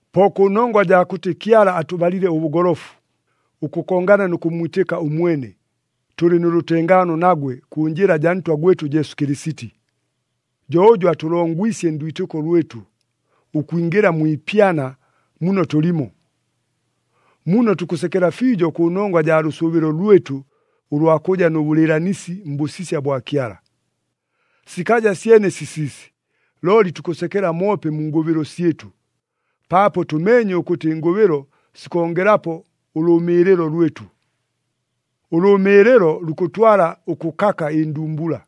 Po kʉnongwa jaa kʉtɨ Kyala atʉbalile ʉbʉgolofu, ʉkʉkongana nʉ kʉmmwitɨka ʉmwene, tʉlɨ nʉ lʉtengaano nagwe kʉ njɨla jaa Ntwa gwɨtʉ Jesu Kɨlɨsiti. Jo ʉjʉ atʉlongwisye ndwitɨko lwɨtʉ, ʉkwingɨla mwi ipyana muno tʉlimo. Muno tukʉsekela fiijo kʉnongwa jaa lʉsʉʉbɨlo lwɨtʉ ʉlwa kʉja nʉ bʉlɨɨlanisi mbʉsisya bwa Kyala. Sikaja syene sisiisi, looli tukʉsekela moope mu ngʉbɨlo syɨtʉ, paapo tʉmeenye ʉkʉtɨ ɨngʉbɨlo sikongelapo ʉlʉʉmɨɨlɨlo lwɨtʉ. Ʉlʉʉmɨɨlɨlo lukʉtwala ʉkʉkaka ɨndumbula,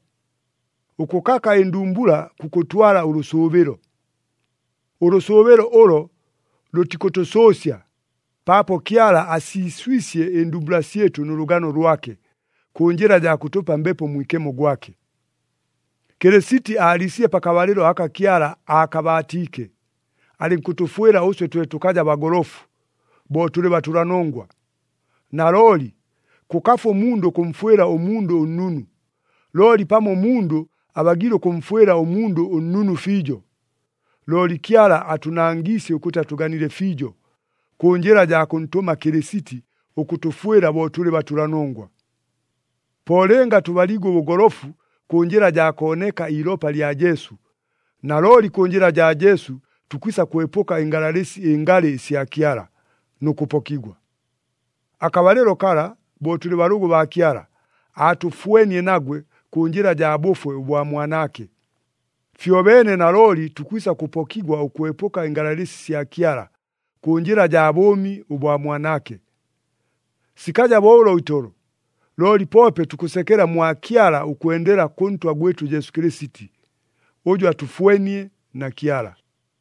ʉkʉkaka ɨndumbula kukʉtwala ʉlʉsʉʉbɨlo. Ʉlʉsʉʉbɨlo ʉlo lʉtikʉtʉsʉʉsya, paapo Kyala asiiswisye ɨndumbula syɨtʉ nʉ lʉgano lwake, kʉ njɨla jaa kʉtʉpa Mbepo Mwikemo gwake. Kɨlɨsiti aaliisile pakabalɨlo aka Kyala aakabaatiike, alɨnkʉtʉfwɨla ʉswe twe tʉkaja bagolofu, bo tʉlɨ batʉlanongwa. Nalooli, kʉkafu ʉmundʉ ʉkʉmfwɨla ʉmundʉ ʉnnunu. Looli pamo ʉmundʉ abagiile ʉkʉmfwɨla ʉmundʉ ʉnnunu fiijo. Looli Kyala atʉnangiisye ʉkʉtɨ atʉganile fiijo, kʉ njɨla jaa kʉntʉma Kɨlɨsiti ʉkʉtʉfwɨla bo tʉlɨ batʉlanongwa. Po lɨnga tʉbaliigwe ʉbʉgolofu kʉ njɨla jaa kooneka iilopa lya Jesu, nalooli kʉ njɨla jaa Jesu tukwisa kwepʉka ɨngalalɨsi ɨngalɨ ɨsya Kyala, nʉ kʉpokigwa. Akabalɨlo kala, bo tʉlɨ balʉgʉ baa Kyala, aatʉfwenie nagwe kʉ njɨla jaa bʉfwe ʉbwa Mwanaake. Fyobeene nalooli tukwisa kʉpokigwa ʉkwepʉka ɨngalalɨsi sya Kyala, kʉ njɨla jaa bʉʉmi ʉbwa Mwanaake. Sikaja bo ʉlo itolo, looli poope tukʉsekela mwa Kyala ʉkwendela kʉ Ntwa gwɨtʉ Jesu Kɨlɨsiti, ʉjʉ atʉfwenie na Kyala.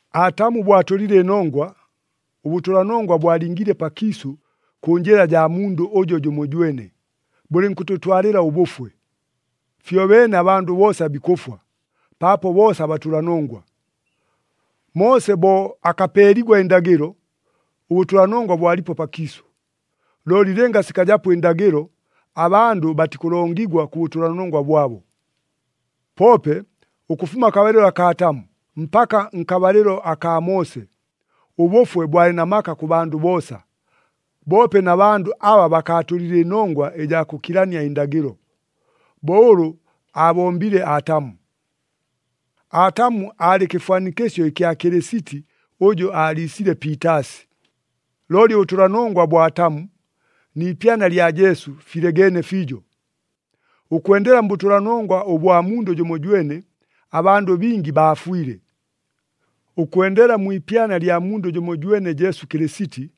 Atamu bo atʉlile ɨnongwa, ʉbʉtʉlanongwa bwalingiile pakiisʉ kʉ njɨla jaa mundʉ ʉjo jʉmojwene, bʉlɨnkʉtʉtwalɨla ʉbʉfwe. Fyobeene abandʉ boosa bikʉfwa, paapo boosa batʉlanongwa. Moose bo akapeeligwa ɨndagɨlo, ʉbʉtʉlanongwa bwalipo pakiisʉ. Looli lɨnga sikajapo ɨndagɨlo, abandʉ batikʉlongigwa kʉ bʉtʉlanongwa bwabo. Poope, ʉkʉfuma akabalɨlo akaa Atamu mpaka nkabalɨlo akaa Moose, ʉbʉfwe bwalɨ na maka kʉ bandʉ boosa, boope na bandʉ aba bakaatʉlile ɨnongwa ɨjaa kʉkilania ɨndagɨlo, bo ʉlʉ aabombile Atamu. Atamu aalɨ kɨfwanikɨsyo ɨkya Kɨlɨsiti ʉjʉ aaliisile piitaasi. Looli ʉbʉtʉlanongwa bwa Atamu, ni ipyana lya Jesu filegeene fiijo. Ʉkwendela mbʉtʉlanongwa ʉbwa mundʉ jʉmojwene, abandʉ bingi baafwile. Ʉkwendela mwi ipyana lya mundʉ jʉmojwene Jesu Kɨlɨsiti,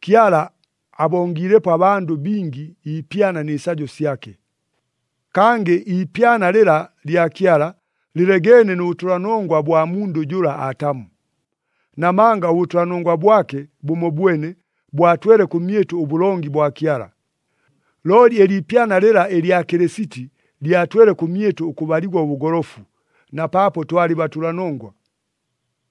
Kyala abongiilepo abandʉ bingi iipyana nɨ sajo syake. Kangɨ iipyana lɨla lya Kyala lɨlegeene nʉ bʉtʉlanongwa bwa mundʉ jʉla Atamu. Namanga ʉbʉtʉlanongwa bwake bʉmobwene bwatwele kʉmyɨtʉ ʉbʉlongi bwa Kyala. Looli ɨliipyana lɨla ɨlya Kɨlɨsiti lyatwele kʉmyɨtʉ ʉkʉbaligwa ʉbʉgolofu, na paapo twalɨ batʉlanongwa.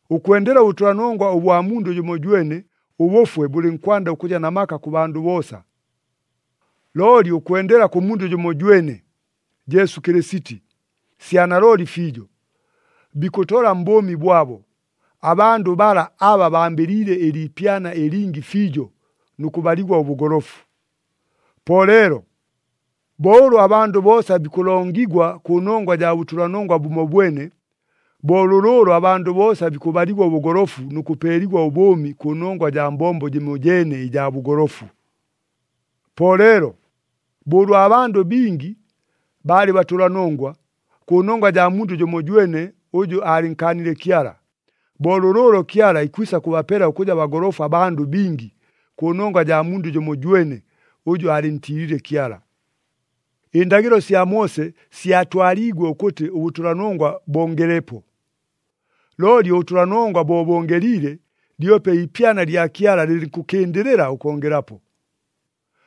Ʉkwendela ʉbʉtʉlanongwa ʉbwa mundʉ jʉmojwene, ʉbʉfwe bʉlɨnkwanda ʉkʉja na maka kʉ bandʉ boosa. Looli ʉkwendela kʉ mundʉ jʉmojwene, Jesu Kɨlɨsiti, sya nalooli fiijo, bikʉtola mbʉʉmi bwabo, abandʉ bala aba bambɨliile ɨliipyana ɨlingi fiijo nʉ kʉbaligwa ʉbʉgolofu. Po leelo, bo ʉlʉ abandʉ boosa bikʉlongigwa kʉnongwa jaa bʉtʉlanongwa bʉmobwene, bo lʉlʉʉlo abandʉ boosa bikʉbaligwa ʉbʉgolofu nʉ kʉpeeligwa ʉbʉʉmi kʉnongwa jaa mbombo jɨmojeene ɨjaa bʉgolofu. Po leelo, bo ʉlwa bandʉ bingi baalɨ batʉlanongwa, kʉnongwa jaa mundʉ jʉmojwene ʉjʉ aalɨnkaanile Kyala, bo lʉlʉʉlo Kyala ikwisa kʉbapela ʉkʉja bagolofu abandʉ bingi, kʉnongwa jaa mundʉ jʉmojwene ʉjʉ aalɨntiilile Kyala. Ɨndagɨlo sya Moose syatwaliigwe ʉkʉtɨ ʉbʉtʉlanongwa bongelepo. Looli ʉbʉtʉlanongwa bo bongeliile, lyope iipyana lya Kyala lɨlɨnkʉkɨndɨlɨla ʉkongelapo.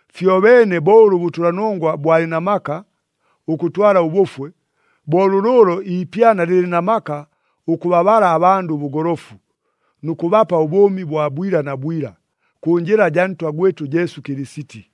Fyobeene bo ʉlʉ ʉbʉtʉlanongwa bwalɨ na maka ʉkʉtwala ʉbʉfwe, bo lʉlʉʉlo iipyana lɨlɨ na maka ʉkʉbabala abandʉ ʉbʉgolofu, nʉ kʉbapa ʉbʉʉmi bwa bwila na bwila, kʉ njɨla jaa Ntwa gwɨtʉ Jesu Kɨlɨsiti.